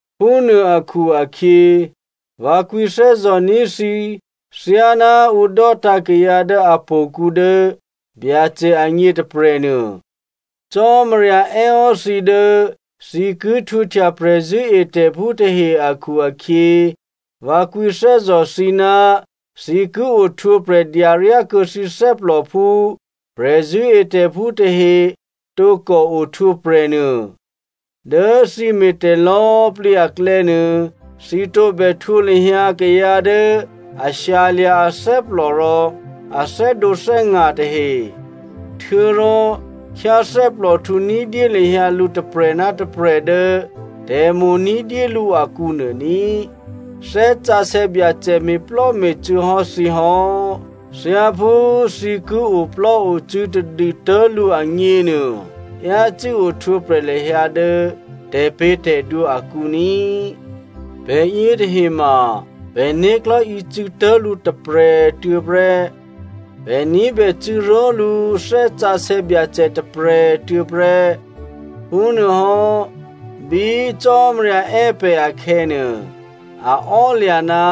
Phúnuô akhu-akhyě, vǎ kwǐthè́zò̤ní̤ thǐ thyáná ǔ dò́tǎ̤ kayǎ dố htò̌kǔ dố Byacè agně tôprè̤nuô. Cò́marya è́hò́ thǐ dố thǐ ki htwǒhtya prè̤zṳ̂́etè̤phú tahe akhu-akhyě vǎ kwǐthè́zò̤ thǐ ná thǐ ki ohtwǒprè̤ dyaryákuô̌ thǐ thè́plò phú prè̤zṳ̂́etè̤phú tahe tǒkò ohtwǒprè̤ nuô. Dố thǐ me̤tè̤ lò̌꤮ plǐ aklè̌nuô, thǐ tǒbè htwǒ lahyǎ kayǎ dố a shyalya̤ athè́plò rò a thè́dǒthè́nga̤ tahe. Htuô̌rò khyáthè́plòhtǔ ní̤dyé lahyǎ lǔ tôprè̤ ná tôprè̤ dố tè̤mo̤ ní̤dyélǔ akǔ nuô ní꤮. Thè́ Sǎsè̌ Byacè me̤plò́me̤cû̌ hò́ thǐ hò́. Thyáphú thǐ ki oplò́ocû̌ tadû tố̤lǔ agněnuô, yácû́ ohtwǒprè̤ lahyǎ dố tè̤pě̤tè̤dwǒ akǔ ní꤮. Pè̤ yětahe ma pè̤né̤klò̤́ ocû̌tố̤lǔ tôprè̤꤮ tuô̌ prè́, pè̤ ní̤bè cû̌ró̤lǔ Thè́ Sǎsè̌ Byacè tôprè̤꤮ tuô̌ prè́. Phúnuôhò́, bí Cò́marya è́ pè̤ akhè̌nuô, a ò́lya̤ ná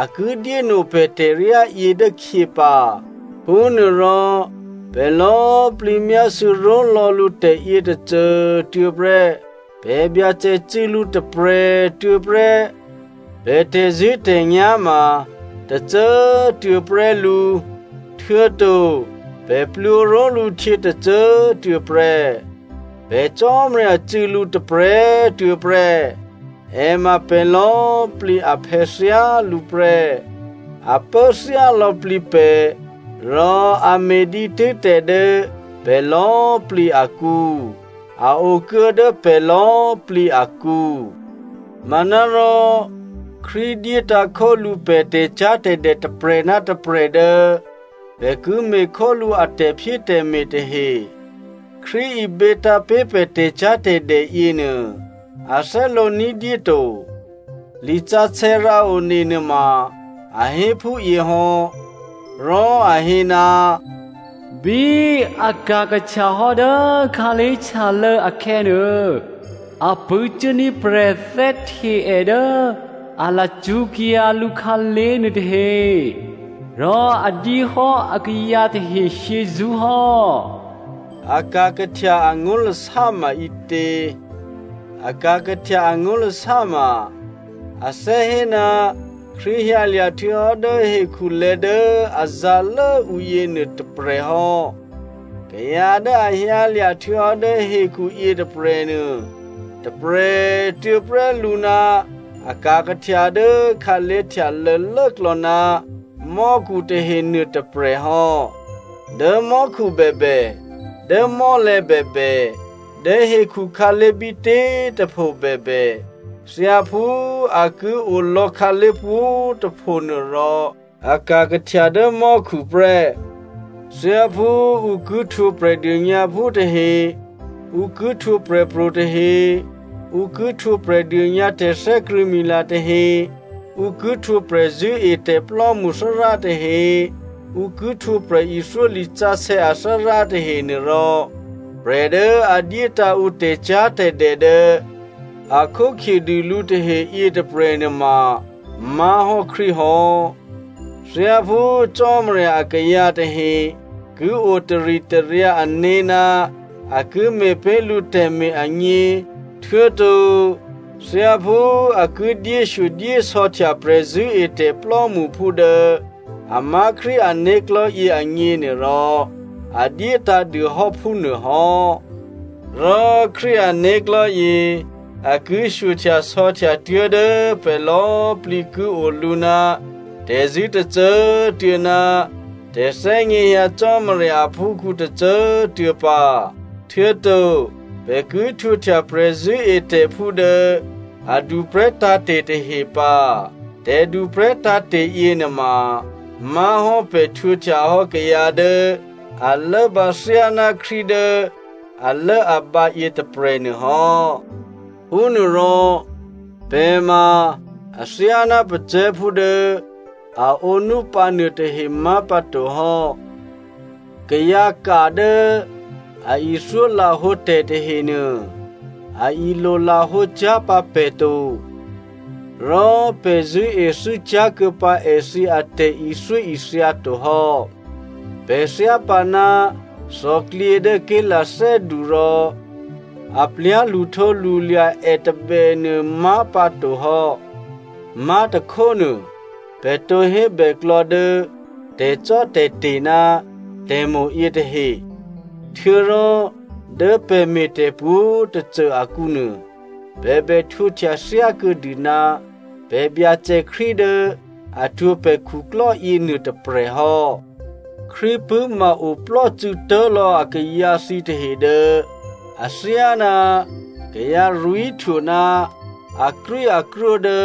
a ki dyéno pè̤ tè̤ryá yě dốkhyě pǎ. Phúnuôrò pè̤ lò̌꤮ plǐ myásû̌ ró̤lò̌ lǔ tè̤yě tôcô꤮ tuô̌ prè́. Pè̤ Byacè cû̌ lǔ tôprè̤꤮ tuô̌ prè́, pè̤ tè̤zṳ̂́tè̤nyá̤ ma tôcô꤮ tuô̌ prè́ lǔ, htuô̌to pè̤ plwǒ ró̤lǔ htyě tôcô꤮ tuô̌ prè́. Pè̤ Cò́marya cû̌ lǔ tôprè̤꤮ tuô̌ prè́. È ma pè̤ lò̌꤮ plǐ aphè̌ thyálǔ prè́. A pố thyá lò̌plǐ pè̤, rò a me̤ dǐtû́ tè̤ dố pè̤ lò̌꤮ plǐ akǔ. A okuô̌ dố pè̤ lò̌꤮ plǐ akǔ. Manárò Krístu dyétǎ̤ khólǔ pè̤ tè̤cyá̤tè̤dè tôprè̤ ná tôprè̤ dố pè̤ ki me̤khólǔ a tè̤phyétè̤me̤ tahe. Krístu ibětǎ̤ pé̤ pè̤ tè̤cyá̤tè̤dè yěnuô, a thè́lǒ ní̤dyé to. Lisǎsè̌ rǎone nuôma a hé phúyě hò́. Rò a hé, “Bí a ka̤ kahtyahò́ dố khǎlé̤htyalô̌ akhè̌nuô, a pṳ̂́cuốní̤ prè̤thè́hte è dố a lacṳ́kyǎ lǔkhǎlé̤ nuôtahe. Rò a dyéhò́ akayǎ tahe shyězṳ́ hò́.” “A ka̤ kahtya,” angó̤lasá ma ǐtě? “A ka̤ kahtya,” angó̤lasá ma a thè́ hé ná Krístu hyǎlya̤ htuô̌hò́ dố hekhulè̤̌ dố a zǎ̤lố ǔ yěnuô tôprè̤ hò́. Kayǎ dố a hyǎlya̤ htuô̌hò́ dố hekhu yětôprè̤nuô, tôprè̤꤮ tuô̌ prè́ lǔ ná a ka̤ kahtya dố khǎlé̤htyalô̌ lốklò̌ ná mò́khu tahe nuôtôprè̤ hò́. Dố mò́khu bèbè, dố mò́lè̤̌ bèbè, dố hekhu khǎlé̤ bítě꤮ tôpho bèbè, thyáphú a ki olò̌ khǎlé̤ pwǒ̤꤮ tôphonuô rò, a ka̤ kahtya dố mò́khu prè́. Thyáphú ǔ ki htwǒ Prè̤dônyǎphú tahe, ǔ ki htwǒ prè̤pro̤ tahe, ǔ ki htwǒ prè̤dônyǎ tè̤thè́krṳ̂̌mila tahe, ǔ ki htwǒ prè̤zṳ̂́etè̤plò́mṳ Thárá tahe, ǔ ki htwǒ prè̤ithyó lisǎsè̌ athárá tahenuôrò, prè̤ dố a dyétǎ̤ ǔ tè̤cyá̤tè̤dè dố a khókhyedû lǔ tahe yětôprè̤ nuôma má̤hò́ Krístu hò́. Thyáphú Cò́marya akayǎ tahe ki o taritaryǎ ané̤ ná a ki me̤ pé̤ lǔ tè̤me̤ agně, htuô̌to thyáphú a ki dyéshyodyésò̌htya prè̤zṳ̂́etè̤ plò́mṳphú dố a má̤ Krístu ané̤klò̤́yě agněnuôrò, a dyétǎ̤ dûhò́ phúnuôhò́. Rò Krístu ané̤klò̤́yě a ki shyohtyasò̌htya tuố̤dố pè̤ lò̌꤮ plǐ ki olǔ ná tè̤zṳ̂́ tôcô꤮ tuô̌ ná tè̤thè́gněhyǎ Cò́marya aphúkhǔ tôcô꤮ tuô̌ pǎ. Htuô̌to pè̤ ki htwǒhtya prè̤zṳ̂́etè̤phú dố a duprè̤́ tǎ̤te̤ tahe pǎ. Tè̤duprè̤́ tǎ̤te̤ yěnuôma má̤hò́ pè̤ htwǒhtyahò́ kayǎ dố a lốbǎ thyáná Krístu dố alốabǎ yětôprè̤ nuôhò́. Phúnuôrò pè̤ ma athyáná pacè̤̌phú dố a ǒnúpǎ nuôtahe má̤pǎto hò́. Kayǎka dố a ithyólahǒ tè̤ tahenuô, a ilolahǒ cyá̤ pǎ pè̤ to, rò pè̤ zṳ̂́ethû́ cyá̤kuô̌ pǎ èthǐ atè̤ithyóithya to hò́. Pè̤ thyápǎ ná thòklyě dố ké̤lathè́du rò a plyá̤ lṳhtǒlṳlya̤ è tôbènuô má̤ pǎtohò́. Má̤tôkhónuô, pè̤ tǒ hébèklò̌ dố tè̤cò́tè̤te̤ ná tè̤mo̤ yětahe. Htuô̌rò dố pè̤ me̤ tè̤pwǒ̤꤮ tôcô akǔnuô pè̤ bè htwǒhtya thyákuô̌dû ná pè̤ Byacè Krístu dố a htwǒ pè̤ khuklò́ yěnuô tôprè̤ hò́. Krístu pṳ̂́ma oplò́cû̌ tố̤lò̌ akayǎ thǐtahe dố athyáná kayǎ rwí̤htwo ná akrwíakrwó dố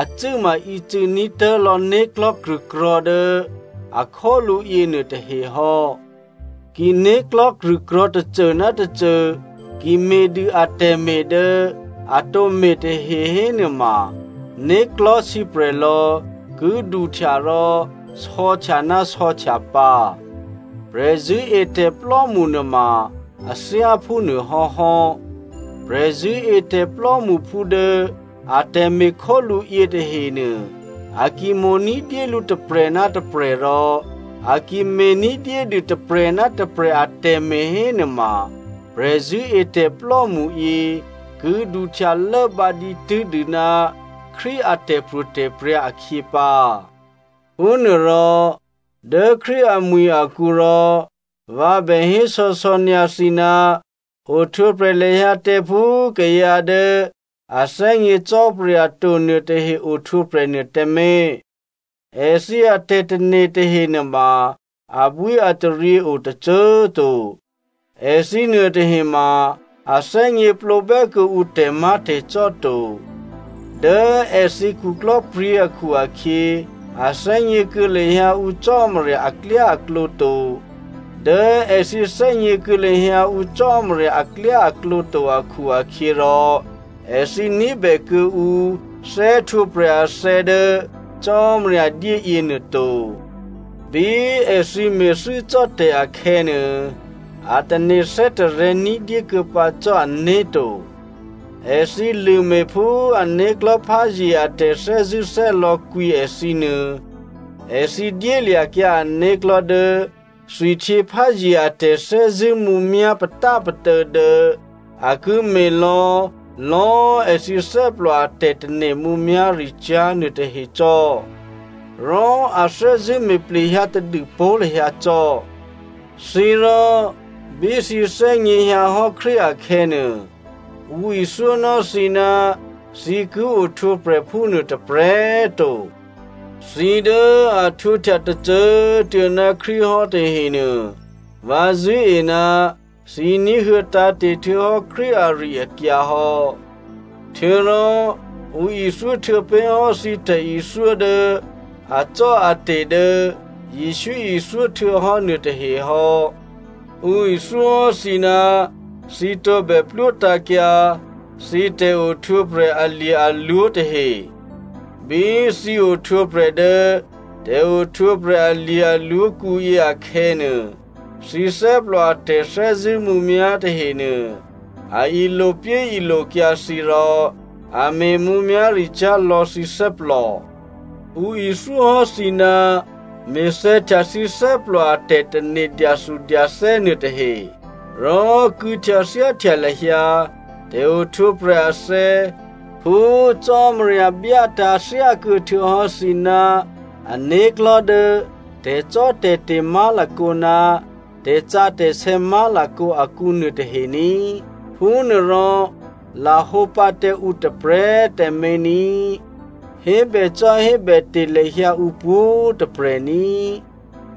acû́ma ícû̌ ní̤tố̤ lò̌ né̤klò̤́ krṳ̂krò̤̌ dố a khólǔ yěnuôtahe hò́. Ki né̤klò̤́ krṳ̂krò̤̌ tôcô ná tôcô ki me̤dû atè̤me̤ dố a tǒ me̤ tahe hénuôma, né̤klò̤́ sǐprè̤lò̌ ki duhtya rò sò̌htya ná sò̌htya pǎ. Prè̤zṳ̂́etè̤plò́mṳ nuôma a thyá phúnuô hò́hò́. Prè̤zṳ̂́etè̤ plò́mṳphú dố atè̤me̤ khólǔ yětahenuô, a ki mo̤ ní̤dyélǔ tôprè̤ ná tôprè̤ rò a ki me̤ ní̤dyédû tôprè̤ ná tôprè̤ atè̤me̤ hénuôma, prè̤zṳ̂́etè̤plò́mṳ yě ki duhtya lốbǎ dǐtû́ dû ná Krístu a tè̤pro̤tè̤prya̤ akhyě pǎ. Phúnuôrò, dố Krístu amwi̤ akǔ rò vǎ bè hésò̌sò̌ nyǎ thǐ ná ohtwǒprè̤ lahyǎ tǎ phú kayǎ dố a thè́gně Cò́marya to nuôtahe ohtwǒprè̤ nuô tǎmé̤. Èthǐ atè̤tane̤ tahe nuôma abwíataryě o tôcô꤮ to. Èthǐ nuôtahe ma a thè́gněplǒ bè́ kuô̌ǔ tè̤má̤tè̤cò́ to. Dố èthǐ khuklò́pryě̤ akhu-akhyě, a thè́gně kuô̌ lahyǎ ǔ Cò́marya aklyáaklǒ to, dố èthǐ thè́gněkuô̌ lahyǎ ǔ Cò́marya aklyáaklǒ to akhu-akhyěrò, èthǐ ní̤bè kuô̌ǔ thè́htwǒprè̤ athè̌ dố Cò́marya dyé yěnuô to. Bí èthǐ me̤thû́ cò́ tè̤ akhè̌nuô, a tane̤ thè́tarè̤̌ ní̤dyé kuô̌pǎ cò́ ané̤ to. Èthǐ lṳ̂me̤ phú ané̤klò̤́ pházye a tè̤thè́zṳ̂́thè́lò̌ kwǐ èthǐnuô, èthǐ dyélya̤kyǎ ané̤klò̤́ dố thwihtyěpházye a tè̤thè́zṳ̂́ mǔmyá̤ patápatô̌ dố a ki me̤lò̌ lò̌꤮ èthǐ thè́plò a tè̤tane̤ mǔmyá̤ricyá̤ nuôtahe cò́. Rò a thè́zṳ̂́ me̤ plehyǎ tadûpó̤ lahyǎ cò́. Thǐ rò, bí thǐ thè́gněhyǎ hò́ Krístu akhè̌nuô, ǔ ithyónò́ thǐ ná thǐ ki ohtwǒprè̤ phúnuô tôprè̤꤮ to. Thǐ dố a htwǒhtya tôcô꤮ tuô̌ ná Krístu hò́ tahenuô, vǎ zṳ̂́e ná thǐ ní̤huô̌ tǎ̤te̤ htuô̌hò́ Krístu ari-akyǎ hò́. Htuô̌rò ǔ ithyó htuô̌ pé̤ hò́ thǐ tè̤ithyó dố acò́ate̤ dố Jesǔ ithyó htuô̌hò́ nuôtahe hò́. Ǔ ithyóhò́ thǐ ná thǐ tǒbè plwótǎ̤kyǎ thǐ tè̤ohtwǒprè̤ alye̤-alwǒ tahe. Bí thǐ ohtwǒprè̤ dố tè̤ohtwǒprè̤ alye̤-alwǒ kǔyě akhè̌nuô, thǐ thè́plò a tè̤thè́zṳ̂́ mǔmyá̤ tahenuô a ilopyéilokyǎ thǐ rò a me̤ mǔmyá̤ricyá̤ lò̌ thǐ thè́plò. Ǔ ithyóhò́ thǐ ná me̤thè̌htya thǐ thè́plò a tè̤tane̤ dyathudyathè́ nuôtahe. Rò kû̌htyathyáhtya lahyǎ tè̤ohtwǒprè̤ athè̌ phú Cò́marya byátǎ̤ thyákuô̌ htuô̌hò́ thǐ ná ané̤klò̤́ dố tè̤cò́tè̤te̤ má̤lakǒ ná tè̤sǎsè̌ má̤lakǒ akǔ nuôtahe ní꤮. Phúnuôrò lahǒ pǎ tǎ ǔ tôprè̤꤮ tǎmé̤ ní꤮. Hébècò́hébète̤ lahyǎ ǔ pwǒ̤꤮ tôprè̤ ní꤮,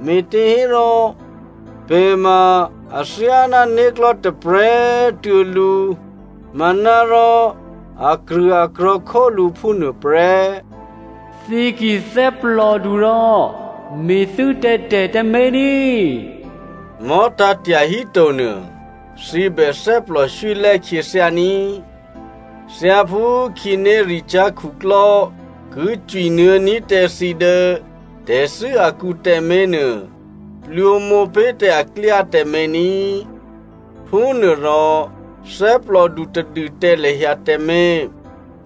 me̤těhérò pè̤ ma athyáná né̤klò̤́ tôprè̤꤮ tuô̌ lǔ, manárò akrṳ̂akrò̤̌ khólǔ phúnuôprè́. Thǐ ki thè́plòdu rò me̤thû́ tǎ tè̤ tǎmé̤ ní꤮. Mò̤́tǎ̤ tyahíto nuô, thǐ bè thè́plò swílè́ khyěthyá ní꤮. Thyáphú khǐnéricyá̤ khuklò́ ki cwinuô̌ní̤ tǎ thǐ dố tè̤thû́ akǔ tǎmé̤nuô, plwǒmǒpé̤ tǎ èklyá tǎmé̤ ní꤮. Phúnuôrò thè́plòdu tadû tǎ lahyǎ tǎmé̤.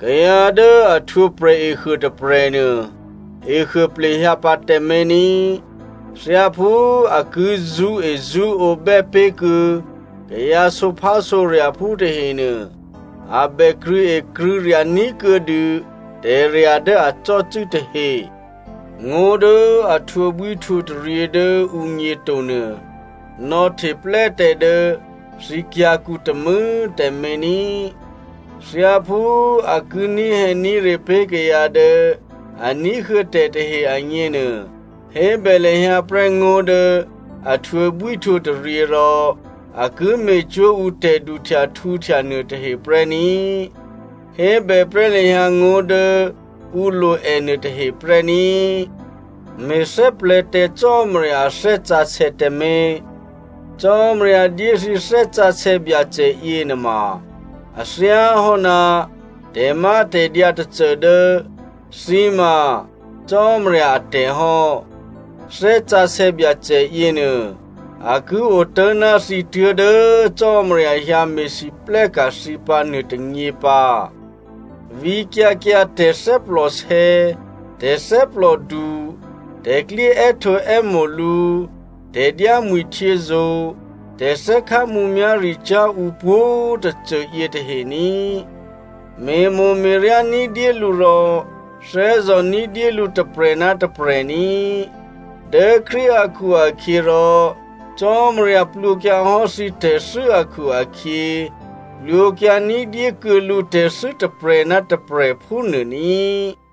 Kayǎ dố a htwǒprè̤ ehuô tôprè̤nuô, ehuô plehyǎ pǎ tǎmé̤ ní꤮. Thyáphú a ki zṳ́ezṳ́ǒ bè́pé̤kuô̌ kayǎ sǒphásǒrya̤phú tahenuô, a bè krṳ̂̌ekrṳ̂̌rya̤ ní̤kuô̌dû tè̤rya̤ dố a cò́cû́ tahe. Ngó̤ dố a htwǒbwíhtwǒtaryě dố ǔgně to nuô, nò̌hteplè́ tǎ dố thǐ kyǎ̤kǔ tômû̌꤮ tǎmé̤ ní꤮. Thyáphú a ki ní̤hè̌ní̤re pé̤ kayǎ dố a ní̤huô̌ tè̤ tahe agněnuô, hébè lahyǎ prè́ ngó̤ dố a htwǒbwíhtwǒtaryě rò a ki me̤cwó̤ ǔ tè̤duhtyahtǔhtya nuôtahe prè́ ní꤮. Hébèprè́ lahyǎ ngó̤ dố ǔ lo è nuôtahe prè́ ní꤮. Me̤thè́plè̤̌ tǎ Cò́marya a Thè́ Sǎsè̌ tǎmé̤. Cò́marya dyé thǐ Thè́ Sǎsè̌ Byacè yěnuôma, a thyáhò́ ná tè̤mátè̤dyǎ tôcô dố thǐ ma Cò́marya atè̤ hò́. Thè́ Sǎsè̌ Byacè yěnuô, a ki otố̤ ná thǐ tuố̤dố Cò́marya hyǎ me̤lwóhteka̤ thǐ pǎ nuôtônyě pǎ. Vǐkyǎ kyǎ tè̤thè́plòsè̌, tè̤thè́plòdu, tè̤klyé è́htǒè́mo̤ lǔ, tè̤dyámwi̤htyězo̤, tè̤thè́khá mǔmyá̤ricyá̤ ǔ pwǒ̤tôcô yětahe ní꤮. Me̤mo̤me̤ryá ní̤dyé lǔ rò thè́zò̤ ní̤dyé lǔ tôprè̤ ná tôprè̤ ní꤮. Dố Krístu akhu-akhyěrò, Cò́marya plwǒkyǎ hò́ thǐ tè̤thû́ akhu-akhyě, plwǒkyǎ ní̤dyé kuô̌ lǔ tè̤thû́ tôprè̤ ná tôprè̤ phúnuô ní꤮.